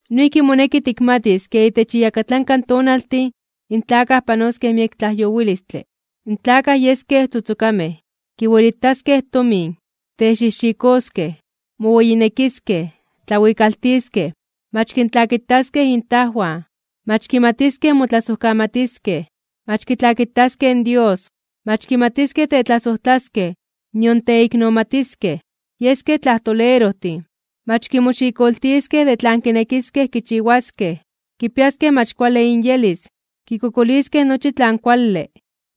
Noijki moneki tikmatis ke itech iyakatlanka tonaltin in tlakaj panoskej miek tlajyowilistle. In tlakaj yeskej tzotzokamej, kiwelitaskej tomin, texijxikoskej, moweyinekiskej, tlawikaltiskej, mach kintlakitaskej intajwan, mach kimatiskej motlasojkamatiskej, mach kitlakitaskej in Dios, mach kimatiskej tetlasojtlaskej nion teiknomatiskej, yeskej tlajtolerojtin, mach kimoxikoltiskej de tlan kinekiskej kichiwaskej, kipiaskej mach kuale inyelis, kikokoliskej nochi tlan kuale,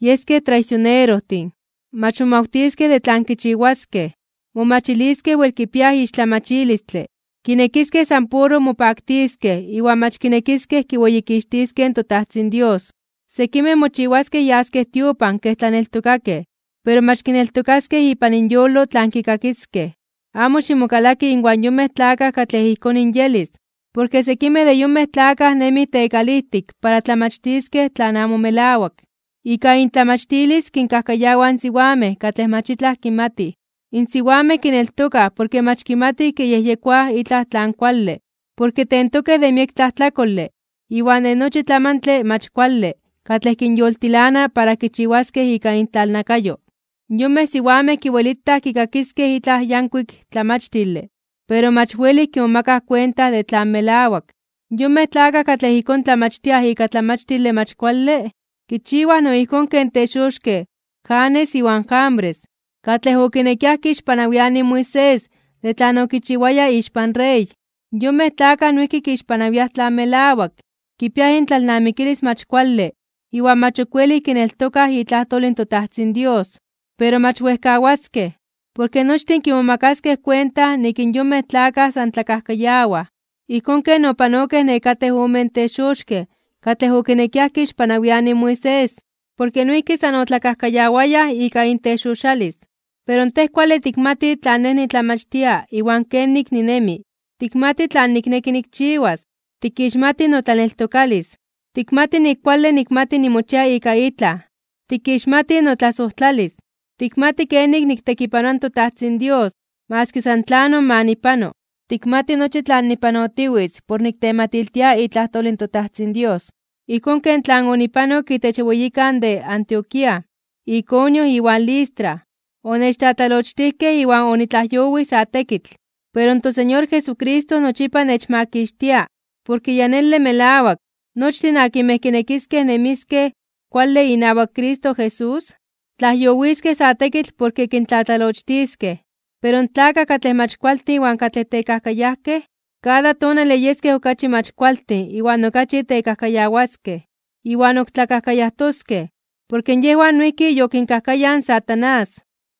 yeskej traisionerojtin, mach momawtiskej de tlan kichiwaskej, momachiliskej wel kipiaj ixtlamachilistle, kinekiskej san puro mopaktiskej iwan mach kinekiskej kiweyikixtiskej in toTajtzin Dios. Sekimej mochiwaskej yaskej tiopan kej tlaneltokakej, pero mach kineltokaskej ipan inyolo tlan kikakiskej. Amo ximokalaki inwan yonmej tlakaj katlej ijkón inyelis. Porke sekimej de yonmej tlakaj nemij tekalijtik para tlamachtiskej tlan amo melawak. Ika intlamachtilis kinkajkayawaj in siwamej katlej mach itlaj kimatij, in siwamej kineltokaj porke mach kimatij kiyejyekoaj itlaj tlan kuale porke tentokej de miek tlajtlakole iwan de nochi tlamantle mach kuale katlej kinyoltilana para kichiwaskej ika intlalnakayo. Yonmej siwamej kiwelitaj kikakiskej itlaj yankuik tlamachtile, pero mach welij kimomakaj kuenta de tlan melawak. Yonmej tlakaj katlej ijkón tlamachtiaj ika tlamachtile mach kuale, kichiwaj no ijkón ken texoxkej (brujojtij) Janes iwan Jambres katlej okinekiaj kixpanawianij in Moisés de tlan okichiwaya ixpan rey. Yonmej tlakaj noijki kixpanawiaj tlan melawak. Kipiaj intlalnamikilis mach kuale iwan mach ok welij kineltokaj itlajtol in toTajtzin Dios. Pero mach wejkawaskej, porke nochtin kimomakaskej kuenta nik in yonmej tlakaj san tlakajkayawaj, ijkón ken opanokej nekatej omen texoxkej (brujojtij) katlej okinekiaj kixpanawianij in Moisés, porke noijki san otlakajkayawayaj ika intexoxalis (inbrujojkayo). Pero tej kuale tikmati tlan nej nitlamachtia iwan kenik ninemi. Tikmati tlan nikneki nikchiwas, tikixmati notlaneltokalis, tikmati nik kuale nikmati nimochia ika itlaj, tikixmati notlasojtlalis, tikmati kenik niktekipanoa in toTajtzin Dios maski san tlanon ma nipano, tikmati nochi tlan nipanotiwitz por niktematiltia itlajtol in toTajtzin Dios, ijkón ken tlan onipanok itech weyikantin de Antioquía, Iconio iwan Listra, onechtlatlalochtijkej iwan onitlajyowij sa tekitl. Pero in toSeñor Jesucristo nochipa nechmakixtia. Porke ya nele melawak, nochtin akinmej kinekiskej nemiskej kuale inawak Cristo Jesús, tlajyowiskej sa tekitl porke kintlatlalochtiskej. Pero in tlakaj katlej mach kualtin iwan katlej tekajkayajkej, kada tonale yeskej okachi mach kualtin iwan okachi tekajkayawaskej, iwan ok tlakajkayajtoskej, porke yejwan noijki yokinkajkayaj in Satanás.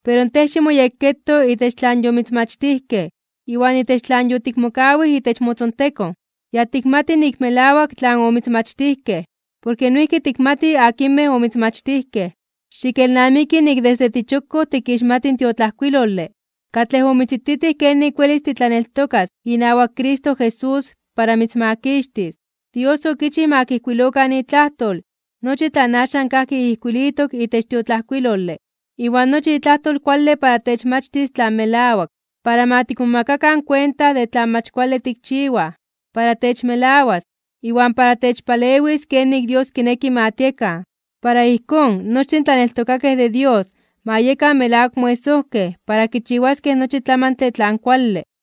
Pero tej ximoyekketo itech tlan yomitzmachtijkej iwan itech tlan yotikmokawij itech motzontekon. Ya tikmati nik melawak tlan omitzmachtijkej, porke noijki tikmati akinmej omitzmachtijkej. Xikelnamiki nik desde tichokkoj tikixmati in tiotlajkuilole, katlej omitzititij kenik welis titlaneltokas inawak Cristo Jesús para mitzmakixtis. Dios okichij ma kijkuilokan itlajtol nochi tlan axan kajki ijkuilitok itech tiotlajkuilole. Iwan nochi itlajtol kuale para techmachtis tlan melawak, para ma tikmomakakan kuenta de tlan mach kuale tikchiwaj, para techmelawas, iwan para techpalewis kenik Dios kineki ma tiekan. Para ijkón, nochtin in tlaneltokakej de Dios ma yekan melawak moesojkej para kichiwaskej nochi tlamantle tlan kuale.